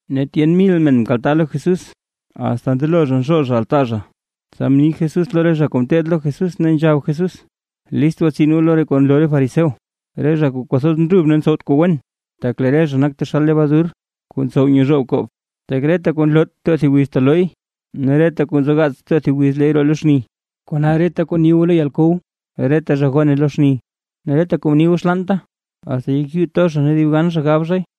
Ne tyen mil men mkaltaa lo Jesús, asta ndelo zha nzhoo altaa zha. Tsa mni Jesús lo re zha kuu ngeteed lo Jesús, ne nzhab Jesús: ―List gwatsin goo lo re kuu nloo re fariseo, re zha kuu kwathoz ndrub ne ntsowt kuu wen, tak lee re zha nak taxal lebadur kuu ntsow nyezhoob koob. Tak reta kuu nloot, too thib wiz telooy, ne reta kuu nzogaats too thib wiz leey roo lo xni. Kona, reta kuu ni goo lo yalkow, reta zha gone lo xni, ne reta kuu mni goo xlaanta, asta yek yuu to zha ne dibgan zha gab zhay.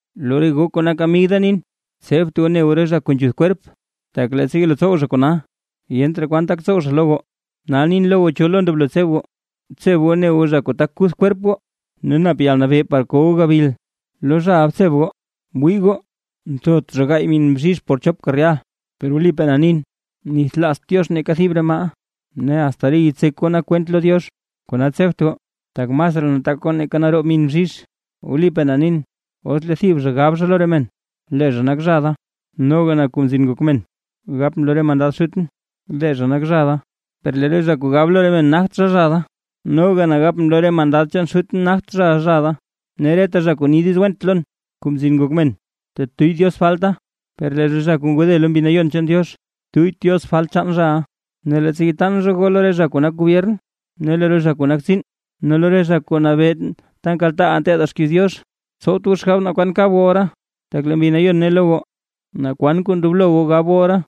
’Lo re goo kuu nak amig da nin. Tsebt goo ne goo re zha kuu nzhuth kwerp, tak leettsa yelo tsow zha kona yent raa kwan tak tsow zha lo goo. Nal nin lo goo naa cho lo ndoblo tseb goo; btseb goo ne goo zha kuu tak kuth kwerp goo ne nap yalnabee par ko goo gabil. Lo zhaʼa btseb goo. ’Wii goo, nthot zha gaay min bzhizh por chopka rehal. Per wlipaa na nin, nithlaazt Diox neeka thib re maaʼa. Ne asta re yitsek goo nak kwent lo Diox. Kona tsebt goo, tak masraa nataak goo nake naroob min bzhizh. ’Wlipaa na nin, os lee thib zha gab zha lo re men lee zha nak zha da, noga na Kuu Mzin Ngok Men, gapʼn lo re mandad Xutʼn, lee zha nak zha da. Per lee re zha kuu gab lo re men nagt zha, zha da, noga na gap lo re mandad chaan Xutʼn nagt zhaʼa zha da. ’Ne reta zha kuu ni diiz went lo na, Kuu Mzin Ngok Men, tetuyy Diox falta, per lee zha kuu ngode lo Mbi Nayon chaan Diox, tuyyt Diox falt chaan zhaʼa. ’Ne leettsa yataan zha goo lo re zha kuu nak gobyern ne lo re zha kuu nak tsiin, ne lo re zha kuu nabee ta nkaltaaʼaa nteedaa xkiiz Diox, tsowt goo xgab naa kwan kab goo ora, tak lee Mbi Nayon ne lo goo naa kwan kuu ndoblo goo gab goo ora.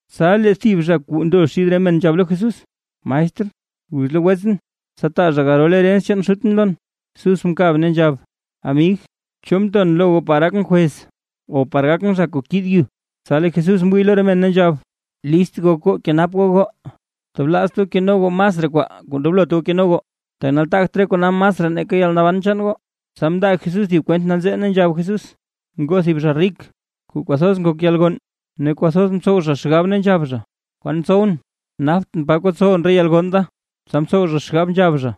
Tsa lee thib zha kuu ndo xid re men nzhab lo Jesús: ―Maestr, guz lo wetsʼn, tsa taa zha garol herens chaan xutʼn lon. Jesús mkab, ne nzhab: ―Amig, ¿cho mton lo goo par gakʼn jwez o par gakʼn zha kuu kiid yu? Tsa lee Jesús mwii lo re men, ne nzhab: ―List gok goo, kenap goo goo, tablaazt goo keno goo masraa kwaa kuu ndoblot goo keno goo, tak nataagt re kona masraa nake yalnaban chaan goo. Tsa mndaa Jesús thib kwent nanzee, ne nzhab Jesús: ―Ngoo thib zha rik, kuu kwathoz ngok yalgonn, ne kwathoz ntsow zha xgab, ne nzhab zha: “¿Kwan tsowʼn? Naptʼn pa kotsowʼn re yalgonn da.” Tsa mtsow zha xgab nzhab zha: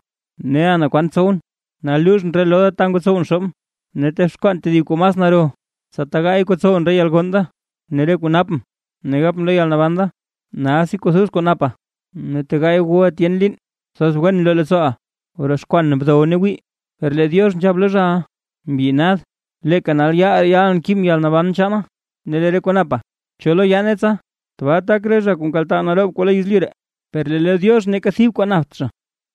“Neʼa na kwan tsowʼn. Nal luuzhʼn re loo da ta ngotsowʼn xoobʼn ne texkwaan tedib kuu mas naro, tsa tegaay kotsowʼn re yalgonn da, ne re kuu napʼn”, ne gapʼn lo yalnaban da: “Nalsi kwathoz kuu napa, ne tegaay wuʼa tyen liin, kwathoz wen bloo leettsooʼa, broxkwan, bdow ne wii”. Per lee Diox nzhab lo zhaʼa: “Mbyi nad, leeka nal yaal ree yalʼn kibʼn yalnaban chaana, ne lee re kuu napa, ¿cho lo yaane tsa?” Tbaa tak re zha kuu nkaltaa naroob kwaa lo yezlyu ree, per lee lo Diox neeka thib kwaa napt zha.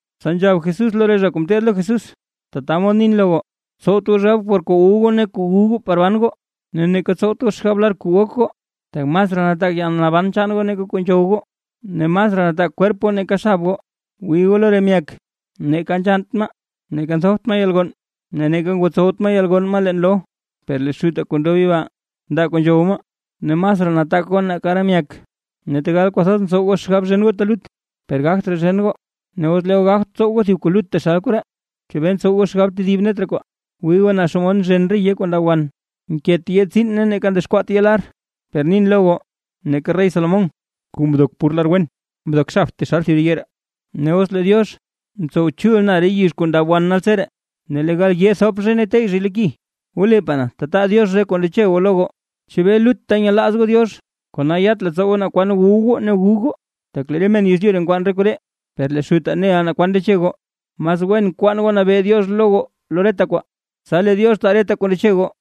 Tsa nzhab Jesús lo re zha kuu ngeteed lo Jesús: ―Tata mod nin lo goo: Tsowt goo xgab por kuu wu goo ne kuu gu goo par ban goo, ne neeka tsowt goo xgab lar kuu gok goo, tak masraa nataak yalnaban chaan goo nake kuu nzhow goo, ne masraa nataak kwerp goo nake xab goo. Wii goo lo re myak, neeka nzhannt maa, neeka nthopt maa yalgonn, ne neeka ngotsowt maa yalgonn maa leen loo, per lee Xutaa kuu ndob yibaa, ndaa kuu nzhow maa. Ne masraa nataak goo nake re myak. Ne tegal kwathoz ntsow goo xgab zhen goo telut, per gagt raa zhen goo. Ne os lee goo gagt tsow goo thib kuu lut taxal koree, ¿chebee ntsow goo xgab tedib net re kwaa? ’Wii goo naa xomod nzhen re yee kuu ndab wan. Nkeet yee tsiin ne neeka ndexkwaat yee lar. Per nin lo goo, neeka rey Salomón, kuu mdok pur lar wen, mdok xabt taxal thib re yee ree. Ne os lee Diox ntsow chul na re yizh kuu ndab wan naltseree, ne lee gal yee thop zhay ne teyy zhay lo ki, wlipaa na tataga taa Diox re kuu ndeche goo lo goo. ¿Chebee lutta nyelaaz goo Diox? Kona yat leettsoo goo naa kwan wu goo ne gu goo. Tak lee re men yezlyu ree nkwaan re koree, per lee Xutaa neʼa naa kwan ndeche goo. Mas wen kwaan goo nabee Diox lo goo lo reta kwaa, tsa lee Diox taa reta kuu ndeche goo.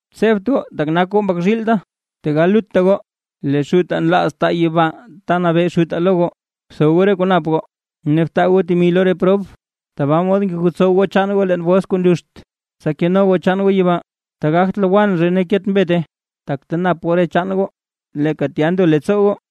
’Tsebt goo, tak goo nak mbak zhiil da, tegal lutta goo, lee Xutaa nlaaz taa yibaa ta nabee Xutaa lo goo. Btho goo re kuu nap goo, ne btaa goo temi lo re prob, tabaa mod ngegotsow goo chaan goo leen bols kuu nluxt, tsa keno goo chaan goo yibaa, ta gagt lowann zhay ne ta ket mbete. Tak ta nap goo re chaan goo, leeka tya ndo leettsoo goo.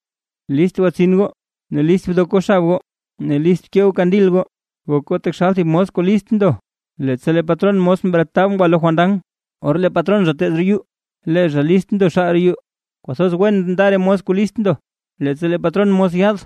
’List gwatsin goo, ne list bdok goo xab goo, ne list bkee goo kandil goo, gok goo taxal thib mos kuu list ndo, leettsa lee patron mos bretab ngwa lo fandan, or lee patron zha teez roo yuu, lee zha lista ndo xaal roo yuu. Kwathoz wen nda re mos kuu list ndo leettsa lee patron mos yaad;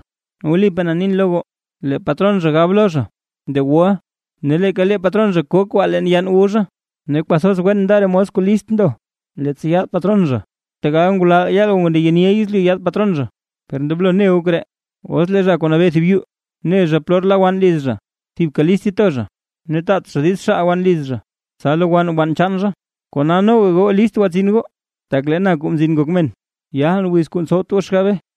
wlipaa na nin lo goo, lee patron zha gab lo zha: “De wuʼa”. Ne leeka lee patron zha ko kwaa leen yann wu zha. Ne kwathoz wen nda re mos kuu list ndo leettsa yaad patron zha, tegal ngulal yaal o ndeyeniʼa yezlyu yaad patron zha. Per ndoblo ne goo koree: Os lee zha kuu nabee thib yuu, ne zha polor la wann liz zha, thibka list to zha ne taat zha diiz xaal wann liz zha, tsa lowann wann chaan zha. Kona noga goo list gwatsin goo, tak lee na, Kuu Mzin Ngok Men, yalʼn wiz kuu ntsowt goo xgabe.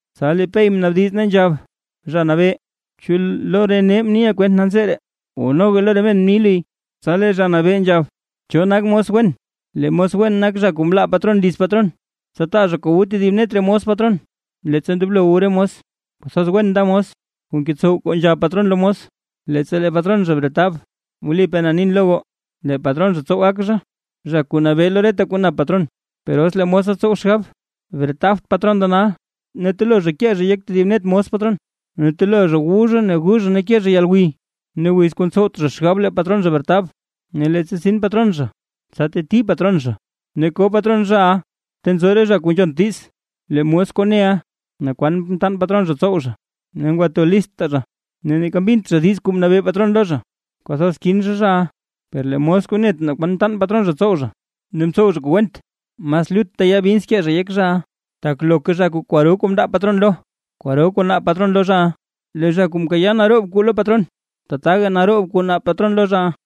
Tsa lee Pey mnaabdiz ne nzhab: ―Zha Nabee, ¿chu lo re nee mniʼa kwent nanzee ree o noga lo re men mni luy? Tsa lee Zha Nabee nzhab: ―¿Cho nak mos wen? Lee mos wen nak zha kuu mlaa patron liz patron, tsa taa zha kuu wu tedib net re mos patron, leettsa ndoblo wu re mos. Kwathoz wen nda mos kuu ngetsow kuu nzhab patron mos lo mos, leettsa lee patron zha bretab. Wlipaa na nin lo goo, lee patron zha tsow gak zha, zha kuu nabee lo reta kuu nap patron. Per os lee mosa tsow xgab: “Bretabt patron da nal”, ne telo zha kee zhay yek tedib net mos patron, ne telo zha wu zha ne gu zha ne ke zha yalgwiy, ne wiz kuu ntsowt zha xgab lee patron zha bretab, ne leettsa tsin patron zha, tsa teti patron zha, ne ko patron zhaʼa ta nzo re zha kuu nzhont diiz. ’Lee mos kuu neʼa, naa kwan mtaan patron zha tsow zha, ne mndo lista zha, ne neeka mbint zha diiz kuu mnabee patron lo zha, kwathoz kin zha zhaʼa. Per lee mos kuu net naa kwan mtaan patron zha tsow zha, ne mtsow zha kuu went, mas lutta yaa bins kee zha yek zhaʼa. Tak loka zha kuu kwaro kwaa mndaa patron lo, kwaro kwaa naab patron lo zhaʼa, ne lee zha kuu mkayaa naroob kwaa lo patron, tataga naroob kwaa naab patron lo zhaʼa.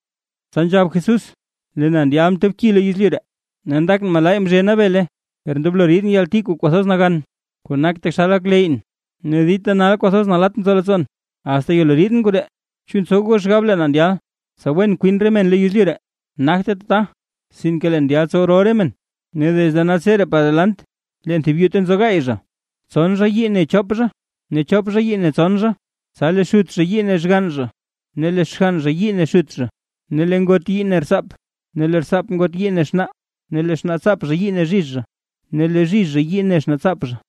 Tsa nzhab Jesús: ―Lee na ndyal mtob ki lo yezlyu ree. ¡Ne ndakʼn malaay mzhena bele! ¡Per ndoblo riidʼn yalti kuu kwathoz nagan, kuu nak taxal gak leyʼn! ¡Ne dita nal kwathoz nalatt nzo leettsoon, asta yelo riidʼn koree! ¿Chu ntsow goo xgab lee na ndyal, tsa wen kwin re men lo yezlyu ree? Nagte tata. Sinke leen ndyal tsow rol re men. Ne desde naltseree par delant, leen thib yuu ta nzo gaay zha, tson zha yii ne chop zha, ne chop zha yii ne tson zha. Tsa lee xut zha yii ne xgann zha ne lee xgann zha yii ne xut zha, ne lee ngot yii ne rtsaap, ne lee rtsaap ngot yii ne xnaa. Ne lee xnaatsaap zha yii ne zhizh ne lee zhizh zha yii ne xnaatsaap zha.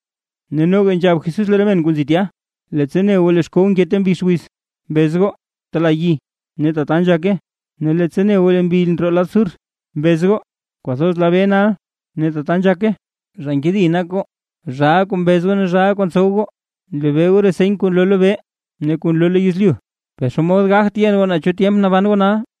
Ne noga nzhab Jesús lo re men kuu nzi tya: ―Leettsa ne goo lee xkow nke ta mbix wiz, mbez goo: “Tala yi”, ne tata nzhake. Ne leettsa ne goo le mbi ndroo lad sur, mbez goo: “Kwathoz la bee nal”, ne tata nzhake. ¡Zha nkedi nak goo, zhaa kuu mbez ne zhaa kuu ntsow goo! Nlebee goo re seny kuu nloo lobee ne kuu nloo lo yezlyu, ¿per xomod gagt yen goo naa cho tyemp naban goo nal?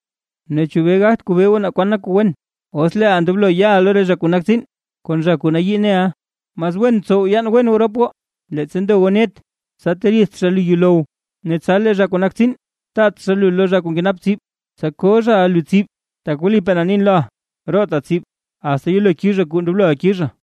’¿Ne chebee gagt kobee goo naa kwan nak kuu wen? Os leeʼa ndoblo yaʼa lo re zha kuu nak tsiin kon zha kuu nayii neʼa, mas wen btsow yaan wen goo rop goo leettsa ndo goo net, tsa teriidt zha lu yuulow, ne tsa lee zha kuu nak tsiin taat zha lu lo zha kuu nkenap tsib, tsa ko zhaʼa lu tsib. Tak wlipaa na nin loʼa, roota tsib, asta yelo kizha kuu ndobloʼa kizha.